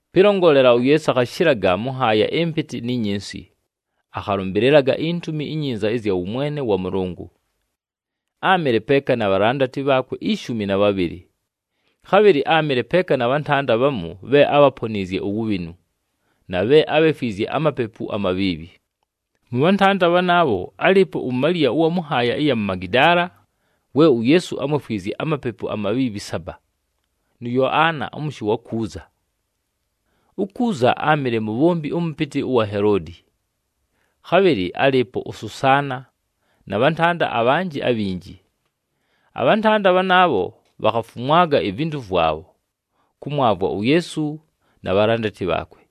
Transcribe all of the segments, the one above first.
Pɨlongolela, uYeesu akhashɨlaga mʉ nhaaya ɨmpɨtɨ ni nyinsi, akhalʉmbɨlɨlaga iNtumi iNyinza ɨzya wʉmwene wa Mʉlʉngʉ. Áamɨle peeka na bhalandati bhaakwe ishumi na bhabhɨlɨ. Khabhɨlɨ áamɨle peeka na bhantanda bhamu bhe ábhaponiizye uwubhinu, na bhe ábhefwizye amapepu amabhiibhi. Mʉ bhantanda bhanaabho, álɨɨpo uMaliya ʉwa mʉ nhaaya ɨya mu Magidaala, we uYeesu ámwefwizye amapepu amabhiibhi saba, nʉ Yoana ʉmʉshɨ wa Kuuza. UKuuza áamɨle mubhombi ʉmʉpɨtɨ ʉwa Heloodi. Khabhɨlɨ álɨɨpo uSusaana, na bhantanda abhanjɨ abhinji. Abhantanda bhanaabho bhakhafumwaga ivintu vwabho, kʉmwavwa uYeesu na bhalandati bhaakwe.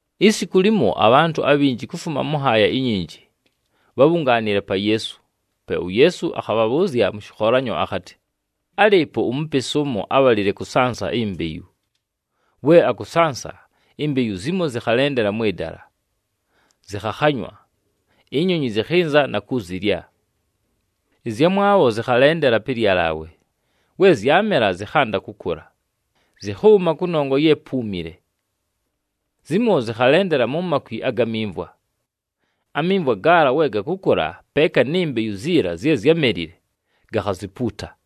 Isiku limo, abhantʉ abhinji kufuma mʉ nhaaya inyinji, bhábhungaanile pa Yeesu. Pe uYeesu akhabhabhʉʉzya mʉ shɨkholanyo akhatɨ, “Álɨɨpo umupesi ʉmo ábhalile kʉsansa imbeyu. We akʉsansa, imbeyu zimo zɨkhalendela mwɨ dala, zɨkhakhanywa, inyonyi zɨkhɨnza na kuzilya. Ɨzyamwabho zɨkhalendela pɨ lyalaawe. We zyamela na kwanda kʉkʉla, zɨkhʉʉma, kʉnongwa ye púumile. Zimo zɨkhalendela mu makwi aga mimvwa. Amimvwa gaala we gakʉkʉla peeka ni mbeyu ziila zye zyámelile, gakhazipuuta.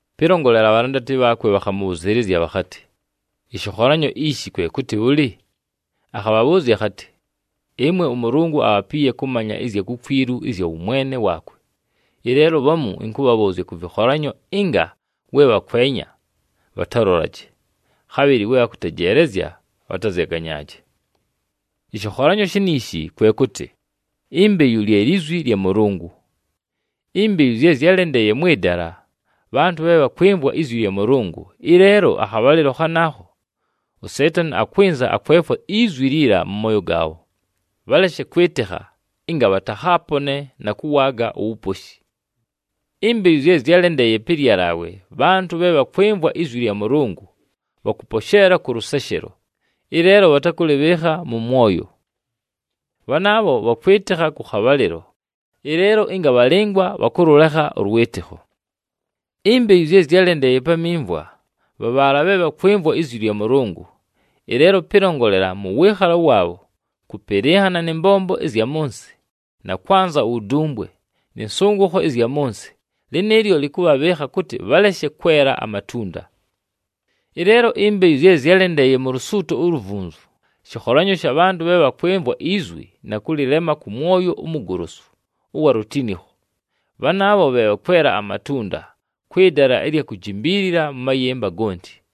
Pɨlongolela, abhalandati bhaakwe bhakhamʉbhʉzɨɨlɨzya bhakhatɨ, “Ɨshɨkholanyo ishi kwe kʉtɨ bhʉlɨ?” Akhabhabhʉʉzya akhatɨ, “Ɨmwe ʉMʉlʉngʉ abhapiiye kʉmanya ɨzya kukwilu ɨzya wʉmwene waakwe. Ɨleelo bhamu ɨnkʉbhabhʉʉzya kʉ vɨkholanyo ɨnga, ‘We bhakwenya, bhatalolaje, khabhɨlɨ we bhakʉtejeelezya, bhatazyaganyaaje.’ “Ɨshɨkholanyo shiniishi kwe kʉtɨ, imbeyu lye lizwi lya Mʉlʉngʉ. Imbeyu zye zyálendeeye mwɨ dala, bhantʉ bhe bhakwɨmvwa izwi lya Mʉlʉngʉ, ɨleelo akhabhalɨlo khanaakho, uSeetani akwɨnza akwefwa izwi liila mʉ mooyo gaabho, bhaleshe kwɨtɨkha, ɨnga bhatakhaapone na kʉwaaga uwuposhi. Imbeyu zye zyálendeeye pɨ lyalaawe, bhantʉ bhe bhakwɨmvwa izwi lya Mʉlʉngʉ, bhakʉposheela kʉ lʉseshelo, ɨleelo bhatakʉlɨbhɨɨkha mʉ mwoyo. Bhanaabho bhakwɨtɨkha kʉ khabhalɨlo, ɨleelo ɨnga bhalɨngwa bhakʉlʉlekha ʉlwɨtɨkho. Imbeyu zye zyálendeeye pa mimvwa, bha bhaala bhe bhakwɨmvwa izwi lya Mʉlʉngʉ, ɨleelo pɨlongolela mʉ wɨɨkhalo waabho, kʉpɨlɨnhana nɨ mbombo ɨzya mʉ nsɨ na kwanza uwudumbwe, nɨ nsʉngʉkho ɨzya mʉ nsɨ, lɨnɨɨlyo lɨkʉbhabhɨɨkha kʉtɨ bhaleshe kwela amatunda. Ɨleelo imbeyu zye zyálendeeye mu lusuuto uluvunzu, shɨkholanyo sha bhantʉ bhe bhakwɨmvwa izwi na kʉlɨlema kʉ mwoyo umugolosu ʉwa lutinikho. Bhanaabho bhe bhakwela amatunda kwɨ dala ɨlya kujimbiilila mʉ mayɨmba gonti.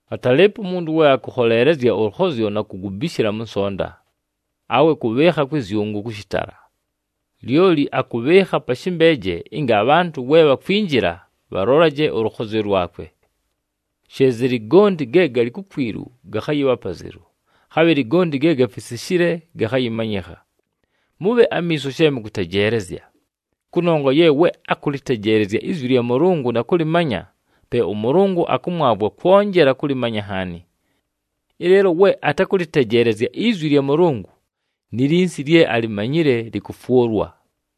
“Atalɨɨpo umuntu we akʉkholeelezya ʉlʉkhozyo na kugubishila mʉ nsonta, awe kʉbhɨɨkha kwɨ zyʉngʉ kʉ shɨtala. Lyoli akʉbhɨɨkha pa shɨmbeeje ɨnga abhantʉ we bhakwinjila, bhalolaje ʉlʉkhozyo lwakwe. She zɨlɨ, gonti ge galɨ kukwilu gakhayɨbha apazelu, khabhɨlɨ gonti ge gafisishile gakhayɨmanyɨkha. Mʉbhe amiiso she mʉkʉtejeelezya, kʉnongwa ye we akʉlɨtejeelezya izwi lya Mʉlʉngʉ na kʉlɨmanya, pe ʉMʉlʉngʉ akʉmwavwa kwonjela kʉlɨmanya nhaani. Ɨleelo we atakʉlɨtejeelezya izwi lya Mʉlʉngʉ, ni linsi lye alimanyile lɨkʉfwʉlwa.”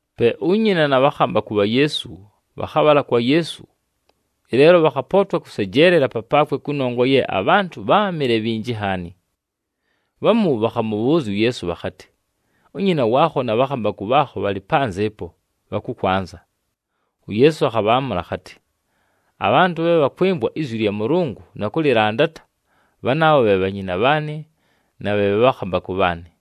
Pe unyina na bhakhambakʉ bha Yeesu, bhakhabhala kwa Yeesu, ɨleelo bhakhapootwa kʉsejeelela papaakwe kʉnongwa ye abhantʉ bháamɨle bhinji nhaani. Bhamu bhakhamʉbhʉʉzya uYeesu bhakhatɨ, “Unyina waakho na bhakhambakʉ bhaakho bhalɨ panzɨ ɨpo, bhakʉkwanza.” UYeesu akhabhaamʉla akhatɨ, “Abhantʉ bhe bhakwɨmvwa izwi lya Mʉlʉngʉ na kʉlɨlandata, bhanaabho bhe bhanyina bhaanɨ na bhe bhakhambakʉ bhaanɨ.”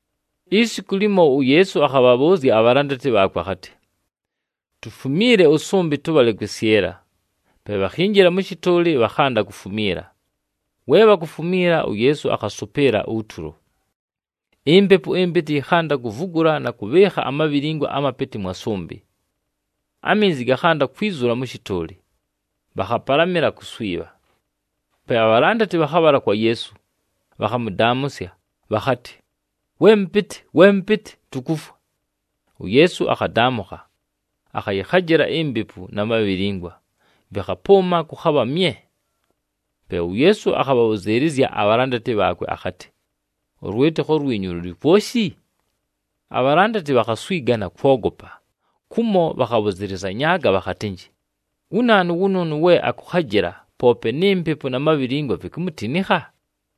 Isiku limo, uYeesu akhabhabhʉʉzya abhalandati bhaakwe akhatɨ, “Tufumiile ʉsʉmbɨ, tʉbhale kwɨsyɨla.” Pe bhakhinjila mʉ shɨtʉʉlɨ, bhakhanda kufumiila. We bhakufumiila, uYeesu akhasʉpɨɨla utulo. Impepu ɨmpɨtɨ yɨkhanda kuvugula na kʉbhɨɨkha amabhilingwa amapɨtɨ mwa sʉmbɨ. Aminzi gakhanda kwizula mʉ shɨtʉʉlɨ, bhakhapalamɨla kuswibha. Pe abhalandati bhakhabhala kwa Yeesu, bhakhamʉdaamʉsya, bhakhatɨ, “We Mʉpɨtɨ! We Mʉpɨtɨ! Tukufwa!” UYeesu akhadaamʉkha, akhayɨkhajɨla impepu na mabhilingwa, vɨkhapʉʉma, kʉkhabha mye! Pe uYeesu akhabhabhʉzɨɨlɨzya abhalandati bhaakwe akhatɨ, “Ʉlwɨtɨkho lwinyu lʉlɨ kwoshi?” Abhalandati bhakhaswiga na kwogopa, kumo bhakhabhʉzɨlɨzanyaaga bhakhatɨnjɨ, “Wu naanu wʉnʉʉnʉ we akʉkhajɨla poope ni mpepu na mabhilingwa, vikumutinikha?”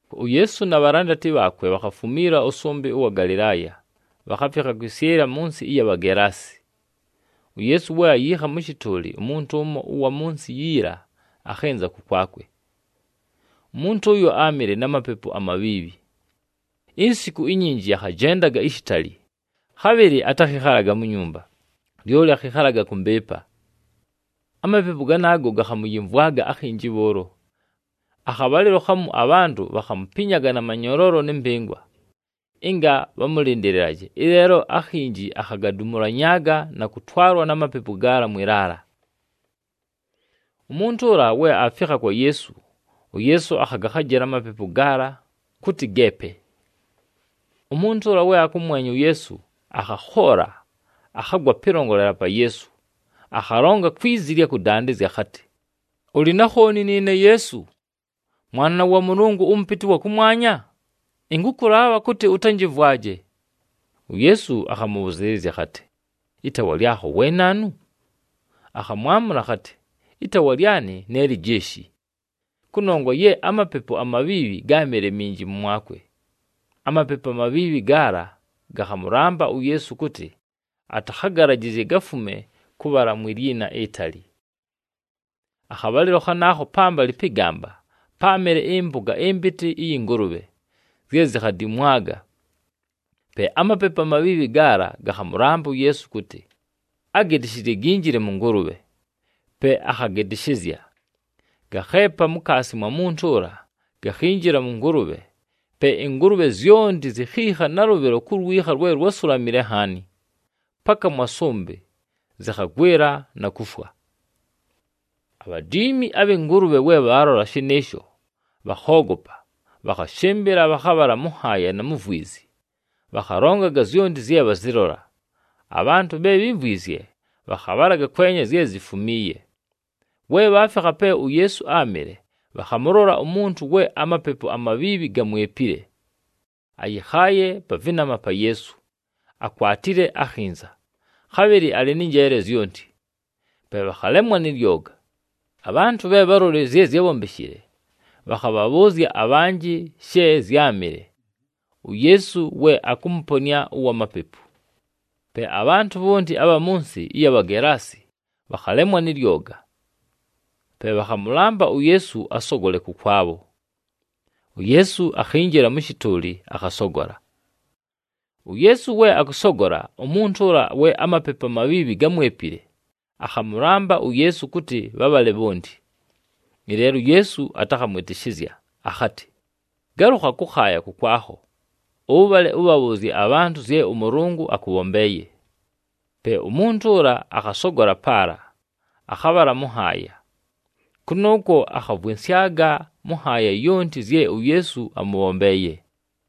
UYeesu na bhalandati bhaakwe bhakhafumiila ʉsʉmbɨ ʉwa Galɨlaaya, bhakhafikha kwɨsyɨla mʉ nsɨ ɨya Bhagelaasi. UYeesu we ayiikha mʉ shɨtʉʉlɨ, umuntu ʉmo ʉwa mʉ nsɨ yiila akhɨnza kʉkwakwe. Umuntu ʉyo áamɨle na mapepu amabhiibhi. Insiku inyinji akhajendaga ishitali, khabhɨlɨ atakhɨkhalaga mu nyumba, lyoli akhɨkhalaga kʉ mbɨɨpa. Amapepu ganaago gakhamʉyɨmvwaga akhinji bhʉʉlo. Akhabhalɨlo khamu abhantʉ bhakhamupinyaga na manyoloolo nɨ mpɨngwa ɨnga bhamʉlɨndɨlɨlaje, ɨleelo akhinji akhavidumulanyaaga na kʉtwalwa na mapepu gaala mwɨ laala. Umuntu ʉla we aafikha kwa Yeesu, uYeesu akhagakhajɨla amapepu gaala, kʉtɨ geepe. Umuntu ʉla we akʉmwenya uYeesu, akhakhoola. Akhagwa pɨlongolela pa Yeesu akhalonga kwi zi ɨlya kʉdandɨzya akhatɨ, “Ʉlɨ na khooni nɨɨne Yeesu, Mwana wa Mʉlʉngʉ ʉMʉpɨtɨ ʉwa kʉmwanya? Ɨnkʉkʉlaabha kʉtɨ ʉtanjɨmvwaje.” UYeesu akhamʉbhʉzɨɨlɨzya akhatɨ, “Ɨtaawa lyakho we naanu?” Akhamwamʉla akhatɨ, “Ɨtaawa lyanɨ ne Lijeeshi,” kʉnongwa ye amapepu amabhiibhi gáamɨle minji mʉmwakwe. Amapepu amabhiibhi gaala gakhamʉlamba uYeesu kʉtɨ atakhagalajɨzye gafume kʉbhala mwi lyina itali. Akhabhalɨlo khanaakho pambalɨ pɨ gamba páamɨle ɨmpʉga ɨmpɨtɨ ɨyɨ ngʉlʉbhe, zye zikhadimwaga. Pe amapepu amabhiibhi gaala gakhamʉlamba uYeesu kʉtɨ, agɨtɨshɨzye ginjile mʉ ngʉlʉbhe, pe akhagɨtɨshɨzya. Gakheepa mukaasi mwa muntu ʉla, gakhinjila mʉ ngʉlʉbhe. Pe ɨngʉlʉbhe zyonti zikhiikha nalʉbhɨlo ku lwikha lwe lusulamile nhaani, paka mwa sʉmbɨ, zɨkhagwɨla na kufwa. Abhadiimi abhɨ ngʉlʉbhe we bhaalola shɨnɨɨsho, bhakhoogopa, bhakhashɨmbɨla, bhakhabhala mʉ nhaaya na mu vwizi, bhakhalongaga zyonti zye bhazɨlola. Abhantʉ bhe bhímvwizye, bhakhabhalaga kwenya zye zifumiiye. We bhaafikha pe uYeesu áamɨle, bhakhamʉlola umuntu we amapepu amabhiibhi gamwepile, ayɨkhaaye pa vɨnama pa Yeesu, akwatile akhinza, khabhɨlɨ alɨ nɨ njeele zyonti, pe bhakhalemwa nɨ lyoga. Abhantʉ bhe bhálolile zye zyábhombeshile, bhakhabhabhʉʉzya abhanjɨ she zyámɨle, uYeesu we akʉmʉponɨa ʉwa mapepu. Pe abhantʉ bhonti abha mʉ nsɨ ɨya Bhagelaasi, bhakhalemwa nɨ lyoga. Pe bhakhamʉlamba uYeesu asogole kʉkwabho. UYeesu akhinjila mʉ shɨtʉʉlɨ, akhasogola. UYeesu we akʉsogola, umuntu ʉla we amapepu amabhiibhi gámwepile, akhamʉlamba uYeesu kʉtɨ bhabhale bhonti. Ɨleelo uYeesu atakhamwɨtɨshɨzya, akhatɨ, “Galʉkhaga kʉkhaaya kʉkwakho, ʉbhale ʉbhabhʉʉzye abhantʉ zye ʉMʉlʉngʉ akʉbhombeeye.” Pe umuntu ʉla akhasogola paala, akhabhala mʉ nhaaya. Kʉnʉʉkwo akhavwɨnsyaga mʉ nhaaya yonti, zye uYeesu amʉbhombeeye.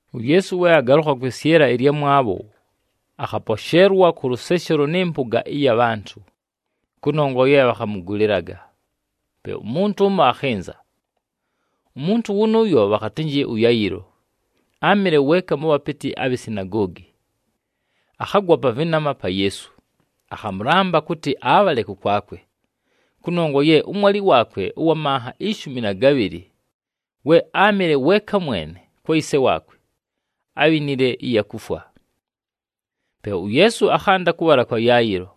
UYeesu we agalʉkha kwɨsyɨla ɨlyamwabho, akhaposheelwa kʉ lʉseshelo nɨ mpʉga ɨya bhantʉ, kʉnongwa ye bhakhamʉgʉlɨlaga. Pe umuntu ʉmo akhɨnza. Umuntu wʉnʉʉyo bhakhatɨnjɨ ʉYayɨlo, áamɨle weeka mʉ bhapɨtɨ abhi sinagoogi. Akhagwa pa vɨnama pa Yeesu, akhamʉlamba kʉtɨ abhale kʉkwakwe, kʉnongwa ye ʉmwalɨ waakwe ʉwa manha ishumi na gabhɨlɨ, we áamɨle weeka mwene kwa yise waakwe, ábhinile ɨya kufwa. Pe uYeesu akhanda kʉbhala kwa Yayɨlo.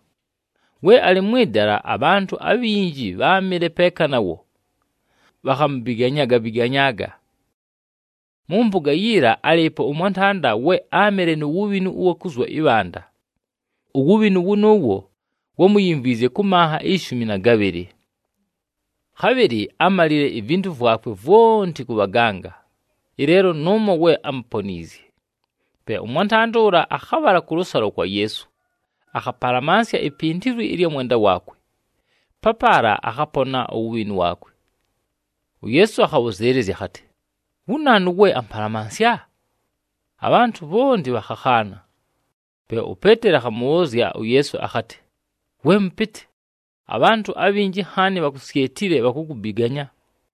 We alɨ mwɨ dala, abhantʉ abhinji bháamɨle peeka nawo, bhakhamubiganyaaga-biganyaaga. Mʉ mpʉga yiila, álɨɨpo ʉmwantanda, we áamɨle nu wubhinu ʉwa kuzwa ɨbhanda. Uwubhinu wʉnʉʉwo wámuyimvwizye kʉ manha ishumi na gabhɨlɨ. [Khabhɨlɨ ámalile ivintu vwakwe vwonti kʉ bhaganga,] ɨleelo nʉʉmo we ámuponiizye. Pe ʉmwantanda ʉla akhabhala kʉlʉsalo kwa Yeesu, akhapalamansya ipindilwi ɨlya mwenda waakwe, papaala akhapona uwubhinu waakwe. UYeesu akhabhʉzɨɨlɨzya akhatɨ, “Wu naanu we ampalamansya?” Abhantʉ bhonti bhakhakhaana. Pe uPeeteli akhamʉbhʉʉzya uYeesu akhatɨ, “We Mʉpɨtɨ, abhantʉ abhinji nhaani bhakusyetile, bhakukubiganya!”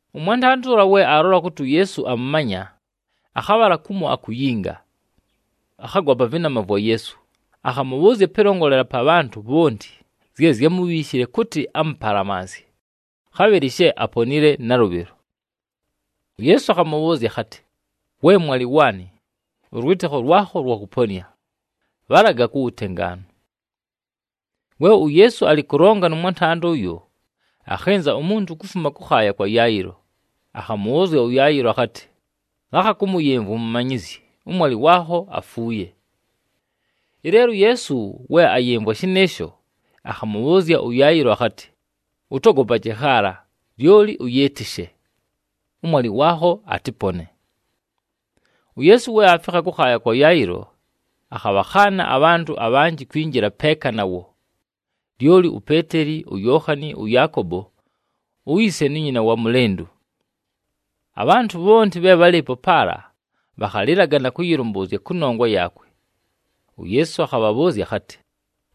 Ʉmwantanda ʉla we aalola kʉtɨ uYeesu amʉmanya, akhabhala kumo akuyinga. Akhagwa pa vɨnama vwa Yeesu, akhamʉbhʉʉzya pɨlongolela pa bhantʉ bhonti zye zyámubhiishile kʉtɨ amʉpalamansye, khabhɨlɨ she aponile nalʉbhɨlo. UYeesu akhamʉbhʉʉzya akhatɨ, “We mwalɨ waanɨ, ʉlwɨtɨkho lwakho lwakʉponɨa. Bhalaga ku wutengaanu!” We uYeesu alɨ kʉlonga nʉ mwantanda ʉyo, akhɨnza umuntu kufuma kʉkhaaya kwa Yayɨlo, akhamʉbhʉʉzya ʉYayɨlo akhatɨ, “Lakha kʉmʉyɨmvwa uMumanyizyi, ʉmwalɨ waakho afuuye.” Ɨleelo uYeesu we ayɨmvwa shɨnɨɨsho, akhamʉbhʉʉzya ʉYayɨlo akhatɨ, “Ʉtogopaje khaala, lyoli ʉyɨɨtɨshe. Ʉmwalɨ waakho atɨpone.” UYeesu we aafikha kʉkhaaya kwa Yayɨlo, akhabhakhaana abhantʉ abhanjɨ kwinjila peeka nawo, lyoli uPeeteli, uYookhani, ʉYaakobo, uyise nu nyina wa mʉlɨndʉ. Abhantʉ bhonti bhe bhálɨɨpo paala, bhakhalɨlaga na kʉyɨlʉmbʉʉzya kʉnongwa yaakwe. UYeesu akhabhabhʉʉzya akhatɨ,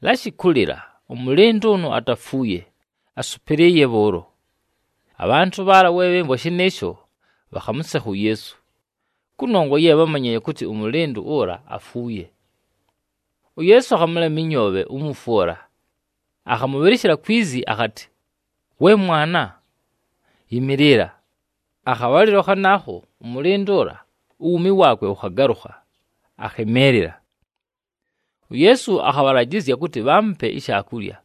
“Lashi kʉlɨla! Ʉmʉlɨndʉ ʉnʉ atafuuye, asʉpɨlɨɨye bhʉʉlo.” Abhantʉ bhaala we bhɨmvwa shɨnɨɨsho, bhakhamʉsekha uYeesu, kʉnongwa ye bhámanyile kʉtɨ ʉmʉlɨndʉ ʉla afuuye. UYeesu akhamʉlema ɨnyoobhe umufwe ʉla, akhamʉbhɨlɨshɨla kwi zi akhatɨ, “We mwana, yɨmɨɨlɨla!” Akhabhalɨlo khanaakho, ʉmʉlɨndʉ ʉla, uwuumi waakwe wʉkhagalʉkha, akhɨmɨɨlɨla. UYeesu akhabhalajɨzya kʉtɨ bhaamupe ishaakulya.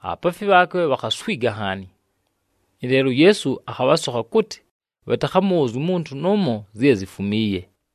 Abhapaafi bhaakwe bhakhaswiga nhaani, ɨleelo uYeesu akhabhasokha kʉtɨ bhatakhamʉbhʉʉzye umuntu nʉʉmo zye zifumiiye.